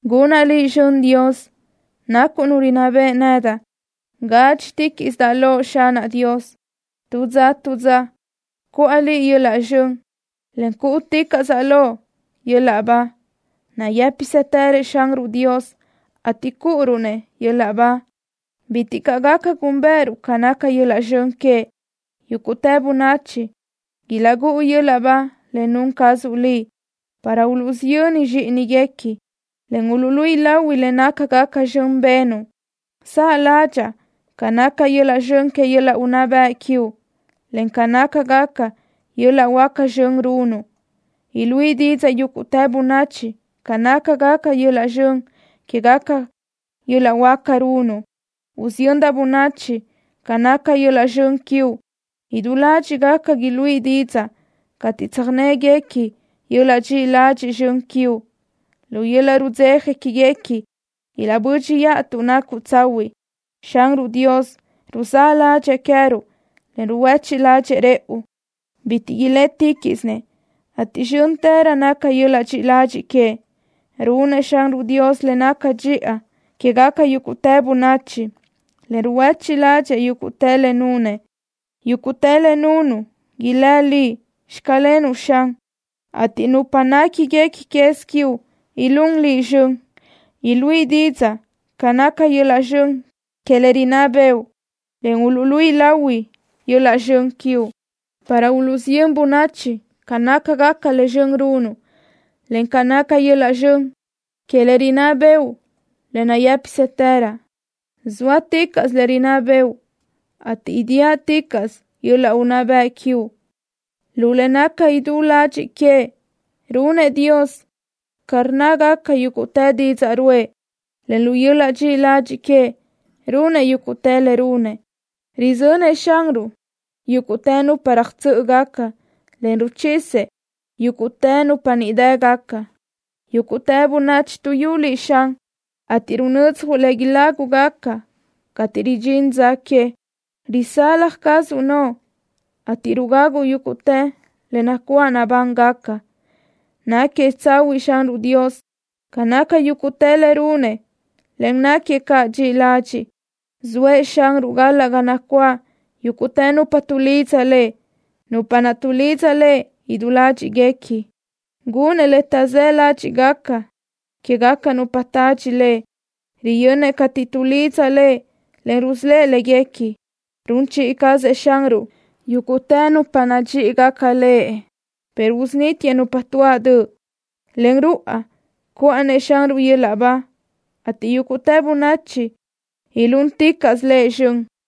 ¡Gunaʼ Liʼ zxön, Dios! ¡Nacuʼ Nu rinná beʼe nedaʼ! ¡Gádxiticaʼsaʼ Loʼ, Xanaʼ Dios! ¡Tu dza tu dza cuʼa Liʼ yöl-laʼ zxön, en cúʼuticaʼsaʼ Loʼ yöl-laʼ ba! ¡Nayë́pisëtërëʼ Xanruʼ Dios, ateʼ cúʼuruʼ-nëʼ yöl-laʼ ba! ¡Bitiʼ caʼ gaca gúnbëʼëruʼ ca naca yöl-laʼ zxön queëʼ! Yúguʼtë bönachi ilaʼgúʼu yöl-laʼ ba le nun cazuʼ Liʼ, para uluʼsiyö́n zxíʼinigaca, en uluʼluíʼi lahui le nácagaca zxön benuʼ. Saʼ ládxaʼa ca naca yöl-laʼ zxön que yöl-laʼ unná bëʼ quiuʼ, en ca nácagaca yöl-laʼ huáca zxön runuʼ. Iluíʼi didzaʼ yúguʼtë bönachi ca naca yöl-laʼ zxön quégaca yöl-laʼ huáca runuʼ. Usiyöndaʼ bönachi ca naca yöl-laʼ zxön quiuʼ. Idú ládxiʼgaca iluíʼi didzaʼ cateʼ tsöjnégaca yöl-laʼ dxiʼi ladxiʼ zxön quiuʼ. Lu yöl-laʼ rudzeja quéguequi ilaʼbö́dxiʼa tuʼ nacuʼ tsahuiʼ. Xanruʼ Dios ruzáʼ ládxëʼë queë́ruʼ, en ruhuéchiʼ ládxëʼë rëʼu. Bitiʼ iléticaʼsëʼ, ateʼ zxö́ntërö naca yöl-laʼ dxiʼi ladxiʼ queëʼ. Runëʼ Xanruʼ Dios le naca dxiʼa quégaca yúguʼtë bönachi, en ruhuéchiʼ ládxëʼë yúguʼtë le nunëʼ. Yúguʼtë le nunuʼ ilë́ Liʼ: “Xclenuʼ” Xan, ateʼ nupa néquiguequi quez quiuʼ ilún Liʼ zxön. Iluíʼi didzaʼ ca naca yöl-laʼ zxön que le rinná bëʼu, en uluʼluíʼi lahui yöl-laʼ zxön quiuʼ, para uluʼsiyö́n bönachi ca nácagaca le zxön runuʼ, en ca naca yöl-laʼ zxön que le rinná bëʼu le nayë́pisëtërö. ¡Zóaticaʼsö le rinná bëʼu, ateʼ idíaʼticaʼsö yöl-laʼ unná bëʼ quiuʼ! ¡Lu le naca idú ladxiʼ queëʼ runëʼ Dios ca rnnágaca yúguʼtë didzaʼ ruʼë, en lu yöl-laʼ dxiʼi ladxiʼ queëʼ runëʼ yúguʼtë le runëʼ! ¡Röjzönëʼ Xanruʼ yúguʼtë nupa röjtsö́ʼögaca, en ruchisëʼ yúguʼtë nupa ndínnegaca! ¡Yúguʼtë bönachi tuʼyú Liʼ, Xan, ateʼ runödzjuʼ le ilágugaca cateʼ ridxín dza que! ¡Rusalaj cazuʼ noʼo en rugaguʼ yúguʼtë le nacuáʼ nabángaca! Náquiëʼ tsahuiʼ Xanruʼ Dios ca naca yúguʼtë le runëʼ en náquiëʼ caʼ dxiʼi ladxiʼ. Zoëʼ Xanruʼ galaʼ ga nacuáʼ yúguʼtë nupa tuʼlidza Lëʼ, nupa naʼ tuʼlidza Lëʼ idú ládxiʼguequi. Gunnëʼ le taʼzë́ ládxiʼgaca quégaca nupa tadxi Lëʼ. Riyönnëʼ cateʼ tuʼlidza Lëʼ, en rusölë́ʼ léguequi. Run chiʼi cazëʼ Xanruʼ yúguʼtë nupa nadxíʼigaca Lëʼ, pero usunítiëʼ nupa tuáʼ döʼ. Len ruʼa cuinaʼ cuʼa-nëʼ Xanruʼ yöl-laʼ ba, ateʼ yúguʼtë bönachi ilúnticaʼsö Lëʼ zxön.